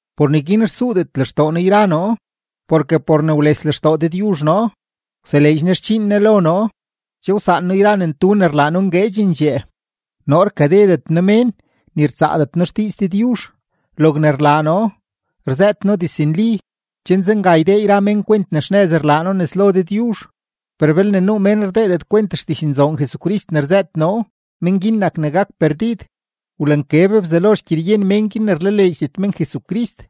Por neguin rsuudet lextoo noo yra noo, porke por ne wles lextoo Dëdyuzh noo, wseleedx Ne xdxiin Ne lo noo. Che wsaan noo yra ne ntu ne rlaa noo ngueedxendxee; noo rkadedet noo mén, ni rtsaadet noo xdiiz Dëdyuzh. Logne rlaa noo, rzëët noo diznli, chen zenga ydee yra mén kwent ne xnëz rlaa noo nes lo Dëdyuzh. Per belne nuu mén rdeedet kwent xdiznzoon Jesucrist ne rzëët noo, men guin nak ne gak perdid. Wlankeb Bzelo xgyeryen men guin ne rlaleedxdet men Jesucrist,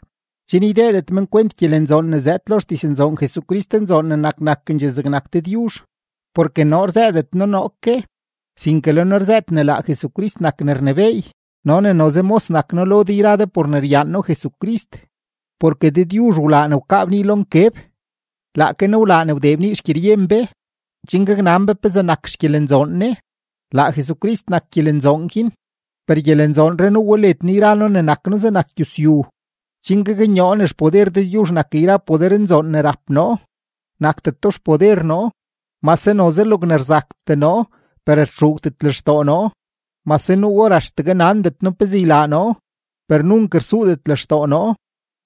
chen ydeedet men kwent gyelenzoon ne zëëd lo xdiznzoon Jesucristnzoon ne nak nakendxee zegnak Dëdyuzh. Porke noo rzëëdet noo noo ke, sinke le noo rzëët ne laa Jesucrist nak ne rnebééy no ne noze mos nak noo lo de yra de por ne ryaan noo Jesucrist. Porke Dëdyuzh wlaa ne wkaa bnii lo nkeb, laake Ne wlaa ne wdee bnii xgyeryen be, chen gaknan be pezee nak xgyelenzoon Ne; laa Jesucrist nak gyelenzoon guin. Per gyelenzoonree nuu we led noo yra noo ne nak noo zegnak gyusyu, chen gaknyoo ne xpoder Dëdyuzh nak yra podernzoon ne rap noo, nakdeto xpoder noo. Mase noze logne rzaktee noo, per rtxuugdet lextoo noo; mase nuu or axtegue nandet noo pezee ylaa noo, per nunk rsuudet lextoo noo.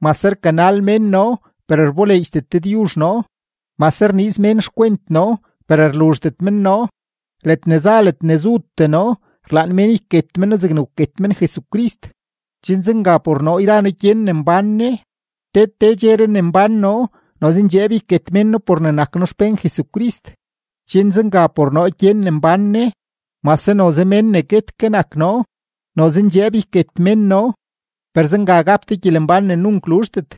Mase rkanal mén noo, per rboleedxdet Dëdyuzh noo; mase rniiz mén xkwent noo, per rluzhdet men noo. Ledne za ledne zutee noo, rlaan mén yket men noo zegne wket men Jesucrist, chen zenga por noo yra noo gyen ne mbán Ne. Te te dxeree ne mbán noo, noze ndxeeb yket mén noo por ne nak noo xpén Jesucrist, chen zenga por noo gyen ne mbán Ne, mase noze mén ne guet ke nak noo. Noze ndxeeb yket mén noo, per zenga gap de gyelembán ne nunk luzhdet.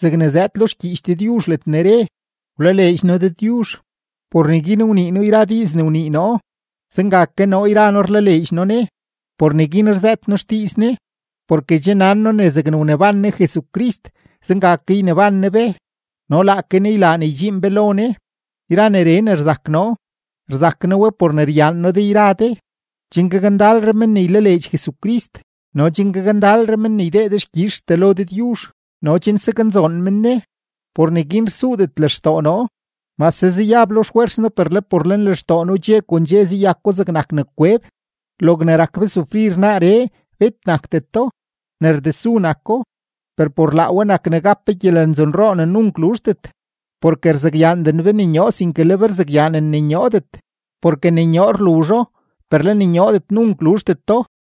Zegne zëëd lo xgyiich Dëdyuzh ledne re: “Wlaleedx noo Dëdyuzh, por neguin wnii noo yra diiz ne wnii noo.” Zenga ke noo yra noo rlaleedx noo Ne; por neguin rzëët noo xdiiz Ne. Porke che nan noo ne zegne wneban Ne Jesucrist, zenga ke yneban Ne be no laake Ne ylaa ne ydxiin be lo Ne. Yra neree ne rzak noo, rzak noo we por ne ryaan noo de yra de, chen gakndalre men ne ylaleedx Jesucrist no chen gakndalre men ne ydee dexkyizhtee lo Dëdyuzh no chen saknzoon men Ne. Por neguin rsuudet lextoo noo; mase zayab lo xfwers noo per le por lenlextoo noo dxe kon dxe zayako zegnak ne kweb. Logne rak be sufrir naaree, bet nakdeto, ne rdesu nako, per por laa we nak ne gap be gyelenzoonroo ne nunk luzhdet. Porke rzakyaanden be ne nyoo, sinke le be rzakyaanen ne nyoodet, porke ne nyoo rluzho, per le ne nyoodet nunk rluzhdeto.